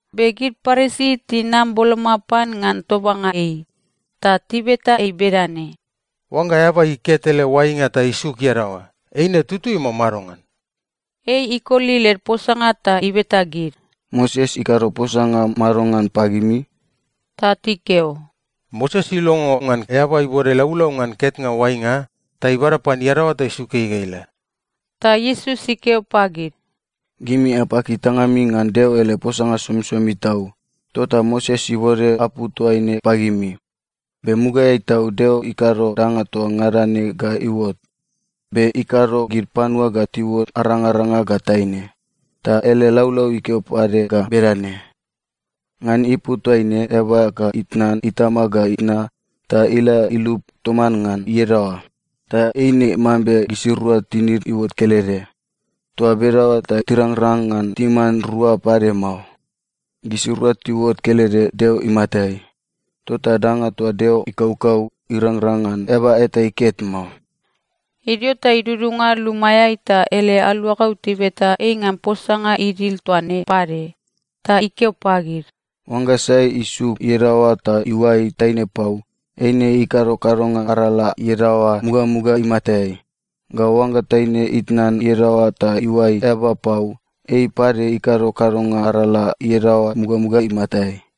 Be gid Parisi tinam boloma pan ngan tobanga ei, ta tibeta ei bedane, “Oangga eaba iket ele oainga ta isuk iadaoa, eine tutui, mao madongan?” Ei ikoli led posanga ta ibeta gid, “Moses ikado posanga madongan pagimi?” Ta tikeo, “Moses ilongo ngan eaba ibode laulau ngan ketnga oainga ta ibada pan iadaoa ta isuk ei ga ila.” Ta Iesus ikeo pagid, “Gimi apaki tangami ngan Deo ele posanga somisomi tau, tota Moses ibode apu toaine pagimi. Be mugaeai tau, Deo ikado danga toa ngada ne ga iuot, be ‘ikado gid panua ga tiuot arangaranga ga taine.’ Ta ele laulau ikeo pade ga bedane, ‘Ngan ipu toaine, eaba ga itnan itama ga itna ta ila ilup toman ngan iadaoa, ta eine mambe gisirua tinid iuot kelede.’ Toa bedaoa ta tirangrang ngan timan rua pade mao. Gisirua tiuot kelede Deo imatai. Tota danga toa Deo ikaukau, irangrang ngan eaba eta iket mao.” Idio ta idudunga lumaeai ta ele aluagau tibeta ei ngan posanga idil toa ne pade. Ta ikeo pagid, “Oangga sai isuk iadaoa ta iuai taine pau, eine ikado kadonga arala iadaoa mugamuga imatai. Ga oangga taine itnan iadaoa ta iuai eaba pau, ei pade ikado kadonga arala iadaoa mugamuga imatai.”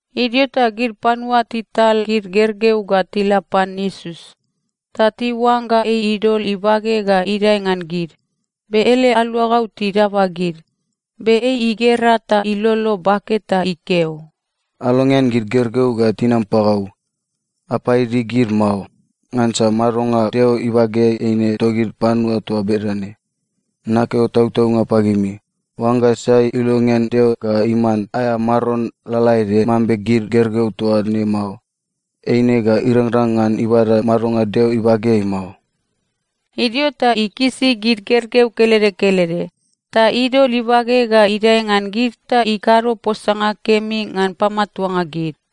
Idio ta gid panua tital gid gergeu ga tila pan Iesus. Ta tiuangga ei idol ibage ga idae ngan gid. Be ele aluagau tidaba gid. Be ei igera ta ilolo bake ta ikeo, “Alongean gid gergeu ga tinam pagau. Apaidi gid mao, ngansa madonga Deo ibageai eine togid panua toa bedane. Nakeo tautaunga pagimi: Oangga sai ilongean Deo ga iman aea maron lalaede mambe gid gergeu toa ne mao, eine ga irangrang ngan ibada madonga Deo ibageai mao.” Idio ta ikisi gid gergeu kelede kelede, ta idol ibage ga idae ngan gid ta ikado posanga kemi ngan pamatuanga gid.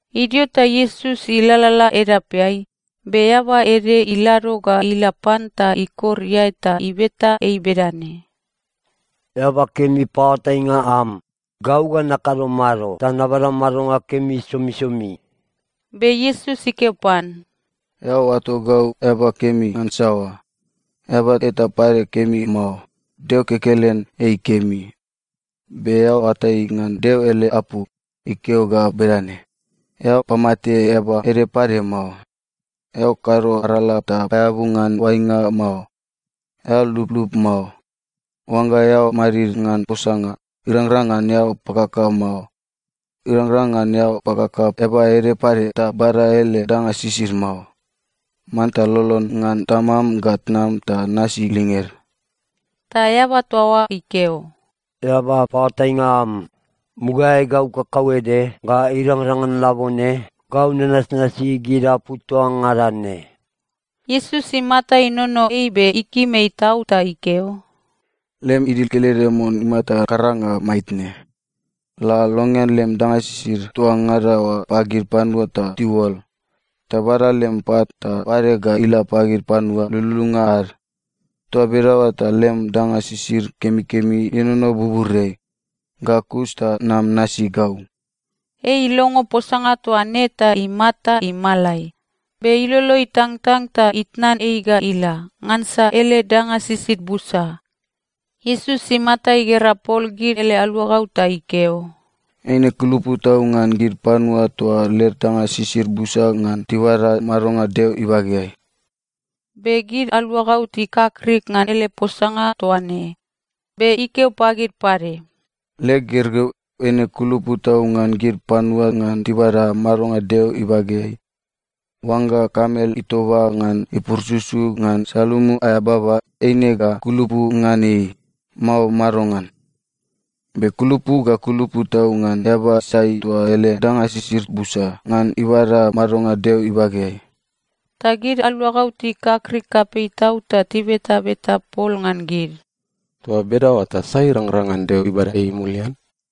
Idio ta Iesus ilalala edapeai, be eaba ede ilado ga ila pan ta ikor iae ta ibeta ei bedane, “Eaba kemi paoatainga am, gau ga nakado mado ta nabada madonga kemi somisomi?” Be Iesus ikeo pan, “Eao oato gau ‘eaba kemi’ ngan saoa? Eaba eta pade kemi mao. Deo kekelen ei kemi. Be eao oatai ngan Deo ele apu. Ikeo ga bedane, ‘Eao pamate eaba ede pade mao. Eao kado arala ta paeabu ngan oainga mao. Eao lublub mao. Oangga eao madid ngan posanga, irangrang ngan eao pakaka mao. Irangrang ngan eao pakaka eaba ede pade ta bada ele danga sisid mao. Manta lolon ngan tamam ga tnam ta nasi linged.’” Ta eaba toa oa ikeo, “Eaba paoatainga am, mugaeai gau kakauede ga irangrang ngan labone, gau nanasnasi gid apu toa ngada ne.” Iesus imata inono ei be ikim ei tau ta ikeo, “Lem idil kelede mon imata karanga maitne. La longean lem danga sisid toa ngada oa pagid panua ta tiuol. Ta bada lem pat ta oade ga ila pagid panua lululunga ad. Toa bedaoa ta lem danga sisid kemikemi ienono buburiai. Ga kus ta nam nasi gau.” Ei ilongo posanga toa ne ta imata imalai, be ilolo itangtang ta itnan ei ga ila. Ngansa ele danga sisid busa. Iesus imata igera pol gid ele aluagau ta ikeo, “Eine kulupu tau ngan gid panua toa led danga sisid busa ngan tibada madonga Deo ibageai!” Be gid aluagau tikakrik ngan ele posanga toa ne. Be ikeo pagid pade, “Leg gergeu, eine kulupu tau ngan gid panua ngan tibada madonga Deo ibageai! Oangga kamel itoba ngan ipurususu ngan salumu aea baba, eine ga kulupu ngan ei, mao madongan? Be kulupu ga kulupu tau ngan eaba sai toa ele danga sisid busa, ngan ibada madonga Deo ibageai.” Ta gid aluagau tikakrik kapei tau ta tibetabeta pol ngan gid, “Toa bedaoa ta sai irangrang ngan Deo ibada ei mulian?”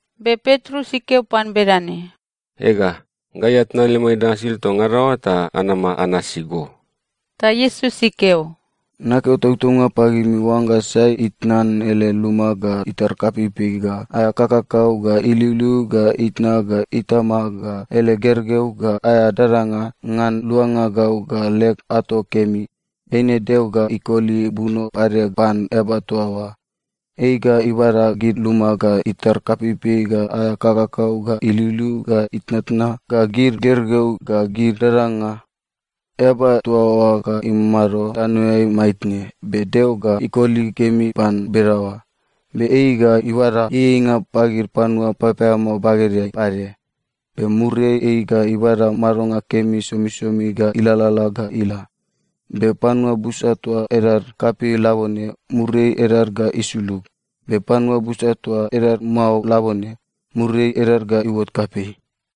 Be Petrus ikeo pan bedane, “Ega, gai atnan lemai danga sisid toa ngada oa ta anama anasi go!” Ta Iesus ikeo, “Nakeo tautaunga pagimi, oangga sai itnan ele luma, ga itar kapeipei, ga aea kakakau, ga iliuliu, ga itna, ga itama, ga ele gergeu, ga aea dadanga, ngan luanga gau ga leg ato kemi, eine Deo ga ikoli buno pade pan eaba toa oa. Ei ga ibada gid luma, ga itar kapeipei, ga aea kakakau, ga iliuliu, ga itnatna, ga gid gergeu, ga gid dadanga. Eaba toa oa ga imamado tanoeai maitne, be Deo ga ikoli kemi pan bedaoa. Be ei ga ibada ieieinga pagid panua papaeamao bagedeai pade. Be muriai ei ga ibada madonga kemi somisomi ga ilalala ga ila. Be panua busa toa edad kapei labone, muriai edad ga isulug. Be panua busa toa edad mao labone, muriai edad ga iuot kapei.”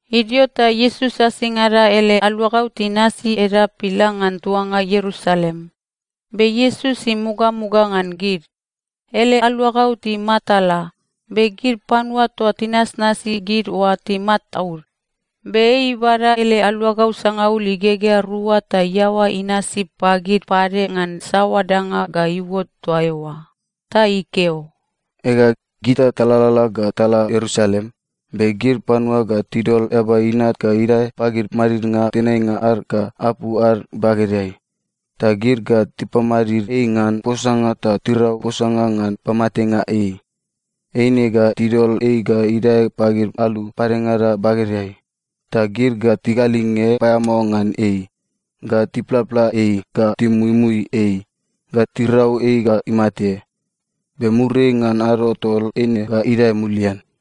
Idio ta Iesus asingada ele aluagau tinasi edap ila ngan tuanga Ierusalem, be Iesus imugamuga ngan gid. Ele aluagau timatala, be gid panua toa tinasnasi gid oa timataud. Be ei ibada ele aluagau sangaul igegea rua ta iaoa inasi pagid pade ngan saoa danga ga iuot toa eoa. Ta ikeo, “Ega, gita talalala ga tala Ierusalem, be gid panua ga tidol Eaba Inat ga idae pagid madidnga tenainga ad ga apu ad bagedeai. Ta gid ga tipamadid ei ngan posanga ta tirau posanga ngan pamatenga ei. Eine ga tidol ei ga idae pagid alu padengada bagedeai. Ta gid ga tigalinge paeamao ngan ei, ga tiplapla ei, ga timuimui ei, ga tirau ei ga imate. Be muriai ngan ado tol, eine ga idae mulian.”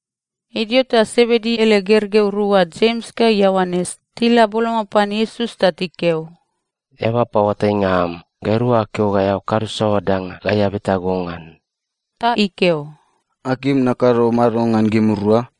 Idio ta Sebedi ele gergeu rua, Jems ga Ioanes, tila boloma pan Iesus ta tikeo, “Eaba paoatainga am, gairua akeo ga eao kado saoa danga gai abeta go ngan.” Ta ikeo, “Akim nakado mado ngan gimirua?”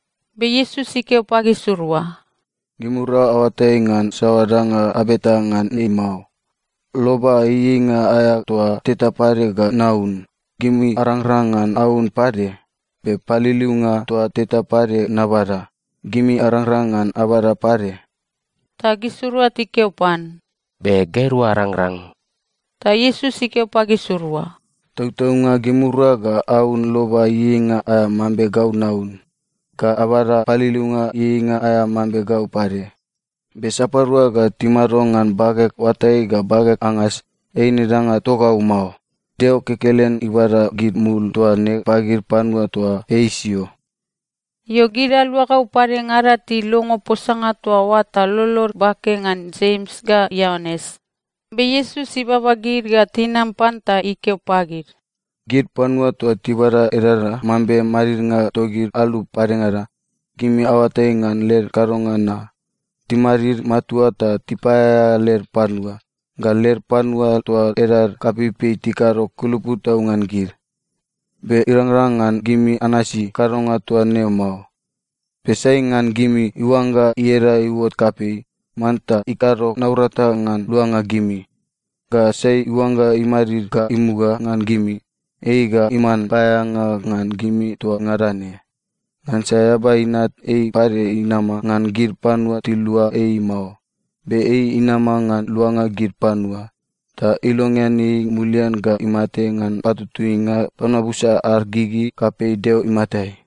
Be Iesus ikeo pagisirua, “Gimirua aoatai ngan saoa danga abeta ngan ne mao. Loba ieieinga aea toa teta pade ga naun, gimi arangrang ngan aun pade? Be paliliunga toa teta pade nabada, gimi arangrang ngan abada pade?” Ta gisirua tikeo pan, “Be. Gairua arangrang.” Ta Iesus ikeo pagisirua, “Tautaunga, gimirua ga aun loba ieieinga aea mambe gau naun, ga abada paliliunga ieieinga aea mambe gau pade. Be sapadua ga timado ngan bageg oatai ga bageg angas, eine danga togau mao. Deo kekelen ibada gid mul toa ne pagid panua toa ei isio.” Io, gid aluagau padengada tilongo posanga toa oa ta lolod bake ngan Jems ga Ioanes. Be Iesus ibaba gid ga tinam pan ta ikeo pagid, “Gid panua toa tibada edaeda mambe madidnga togid alu padengada, gimi aoatai ngan led kadonga na. Timadid matua ta tipaeaea led panua. Ga led panua toa edad kapeipei tikado kulupu tau ngan gid. Be irangrang ngan gimi anasi kadonga toa ne mao. Be sai ngan gimi iuangga ieda iuot kapei, manta ikado naurata ngan luanga gimi. Ga sai iuangga imadid ga imuga ngan gimi, ei ga iman paeaeanga ngan gimi toa ngada ne. Ngansa Eaba Inat, ei pade inama ngan gid panua tilua ei mao, be ei inama ngan luanga gid panua. Ta ilongean ei mulian ga imate ngan patutuinga panua busa ad gigi kapei Deo imatai.”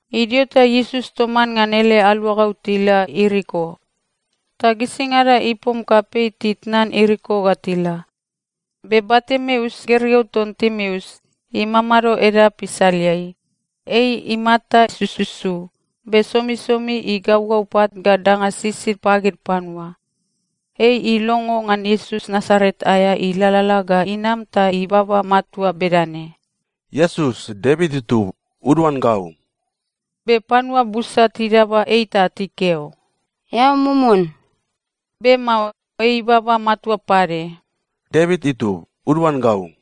Idio ta Iesus toman ngan ele aluagau tila Ieriko. Ta gisingada ipom kapei titnan Ieriko ga tila. Be Bartimeus, gergeu ton Timeus, imamado edap isaleai. Ei imata sususu, be somisomi igaugau pat ga danga sisid pagid panua. Ei ilongo ngan Iesus Nasaret aea ilalala ga inam ta ibaba matua bedane, “Iesus, Devit itub, uduan gau.” Be panua busa tidaba ei ta tikeo, “Eao mumun!” Be mao. Ei ibaba matua pade, “Devit itub, uduan gau!”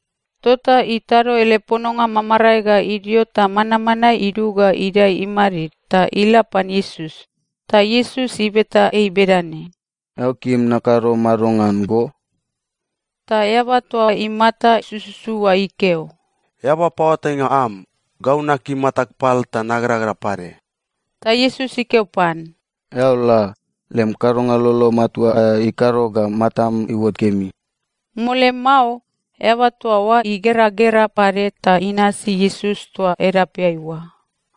Tota itado ele pononga mamarae ga idio ta manmanae idug ga idae imadid ta ila pan Iesus. Ta Iesus ibeta ei bedane, “Eao kim nakado mado ngan go?” Ta eaba toa imata sususu oa ikeo, “Eaba paoatainga am, gau nakim matag pal ta nageragera pade.” Ta Iesus ikeo pan, “Eao la. Lem kadonga lolo matua aea ikado ga matam iuot kemi.” Mole mao, eaba toa oa igeragera pade ta inasi Iesus toa edapeai oa.